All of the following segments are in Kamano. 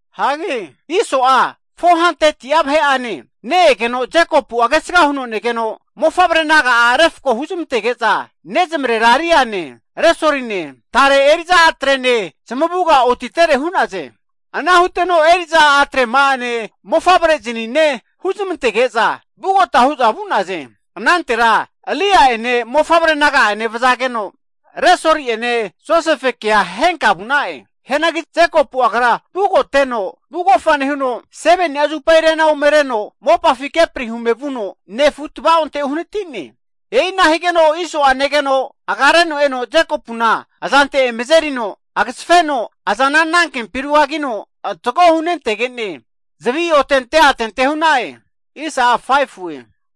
Hagi Iso'a 400'a vahe'ane ne-egeno, Jekopu'a kesga huno negeno mofavre naga'a refko huzmantege'za, nezmarera Liane, Resoline, tare eri'za a'trene zamavuga otitere hu'naze. Ana huteno eri'za a'trema'ane mofavre'zanine huzmantege'za vugota hu'za vu'naze. Anantera Lia'ene mofavre naga'ane vazageno, Resoli'ene Josefekea henka vu'na'e. Hianagi Jekopu'a agra vugoteno vugofa nehuno, 7ni'a zupa rena ome reno mopafi kepri hume vuno nefu tava'onte uhanati'ne. E'ina higeno Iso'a negeno agareno eno Jekopuna azante eme azerino agazafeno, azana anankempi rugagino antako hunentege'ne, zavi otente atente hu'na'e.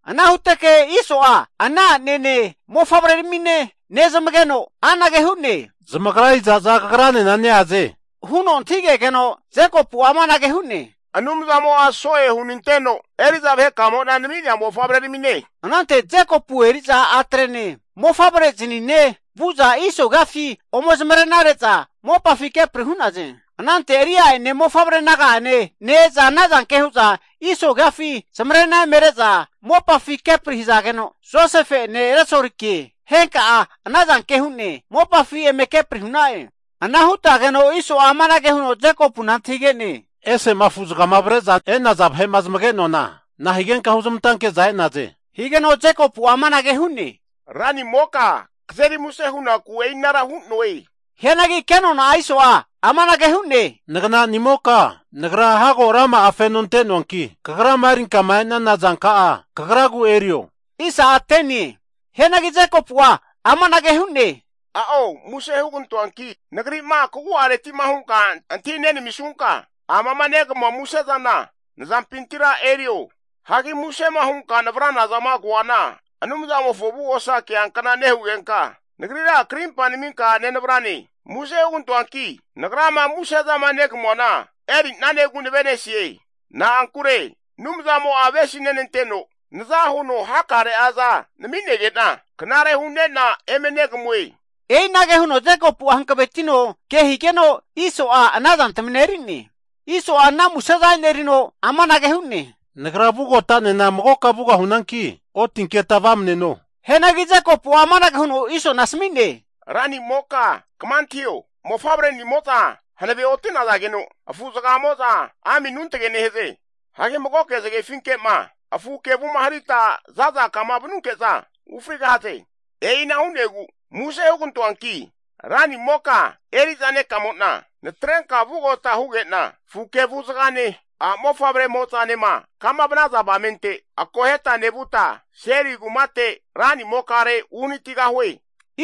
Ana huteke Iso'a ana a'nene mofavre ramine nezmageno anage hu'ne, Zamagra iza'za kagranena neaze? Huno antahigegeno, Jekopu'a amanage hu'ne, Anumzamo'a so'e hunanteno eri'za vahekamo'na nami'nea mofavreramine. Anante Jekopu eri'za a'trene, mofavrezinine vu'za Iso agiafi ome zamarenare'za mopafi kepri hu'naze. Anante Lia'ene mofavre naga'ane ne-eza anazanke hu'za Iso agiafi zamarena eme re'za mopafi kepri hazageno, Josefe'ene Resolike henka'a anazanke hune mopafi eme kepri hu'na'e. Ana hutageno Iso'a amanage huno Jekopuna antahige'ne. Ese'ma afu'zaga avre'za e'naza vahe'ma zamage'noana nahigenka huzmantanke'za e'naze? Higeno Jekopu'a amanage hu'ne, ranimoka kazeri muse hunaku e'inara hu'noe. Hianagi kenona Iso'a amanage hu'ne. Nagnanimoka, nagra hago rama'a feno ante'noanki, kagrama erinkama e'nana zanka'a kagra erio. Hianagi Jekopu'a amanage hu'ne, A'o, muse (plis) hugantoanki nagri'ma kagu'areti'ma hunka antahi nenamisunka amama negamua musezana (gift) nazampintira erio. Hagi musema hunka navrana zama koana, Anumzamofo avugosa keankna nehugenka nagrira krimpa naminka nenavrane. Muse (plis) hugantoanki nagrama muse'zama (gift) negamuana eri'nanegu navenesie. Na'ankure Anumzamo'a avesi nenanteno naza huno hakare'aza nami'nege'na, knare hu'ne'na eme negamue. E'inage huno Jekopu'a hankavetino kehigeno Iso'a ana zantamina eri'ne. Iso'a ana museza (gift) enerino amanage hu'ne, Nagra vugota'nena magoka vugahunanki otinketa vamneno. Hianagi Jekopu'a amanage huno Isona asami'ne, ranimoka kama antahio, mofavrenimo'za hanave oti'nazageno, afu zagamo'za ami anuntage nehaze. Hagi magoke zagefinke'ma afu kevuma harita zaza kama vanunke'za, ufrigahaze. E'ina hu'negu (plis) muse hugantoanki ranimoka, eri'za nekamo'na natrenka vugota huge'na, afu kevu zagane, a'mofavremo'zanema kama vanaza avamente akoheta nevuta, Seiri kumate (Idom) ranimokare uhnatigahue.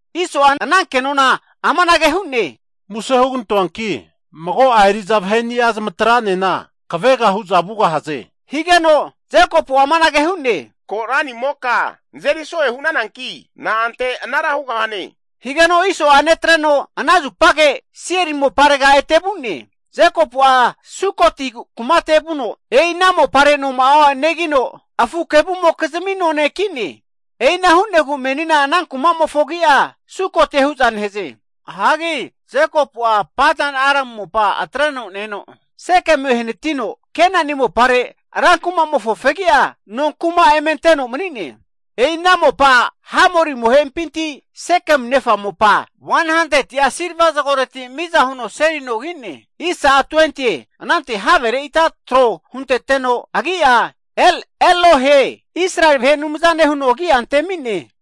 Iso'a ana kenona amanage hu'ne. Muse (plis) hugantoanki mago'a eri'za vaheni'a zamatra'nena kavega hu'za vugahaze, higeno Jekopu'a amanage hu'ne. Ko' ranimoka nazeri so'e hunananki na'ante anara hugahane? Higeno Iso'a netreno, ana zupage Seiri (Idom) moparega ete vu'ne. Jekopu'a Sukoti kumatega vuno, e'i ana mopare noma'a negino, afu kevumokizmi none kine. E'ina hu'negu menina ana kumamofo agi'a Sukotie hu'za nehaze. Hagi Jekopu'a Padan-aramu mopa atreno ne-eno Sekemu ehanatino, Kenani mopare ra kuma'mofo fegi'a nonkuma (kemi) eme anteno mani'ne. E'i ana mopa Hamori amohe'impinti, Sekemu nefa mopa 100'a silva zagoreti miza huno seli nona ki'ne. Anante havere ita tro hunteteno agi'a El-Elohe Israeli vahe Anumzane, huno agi'a antemi'ne.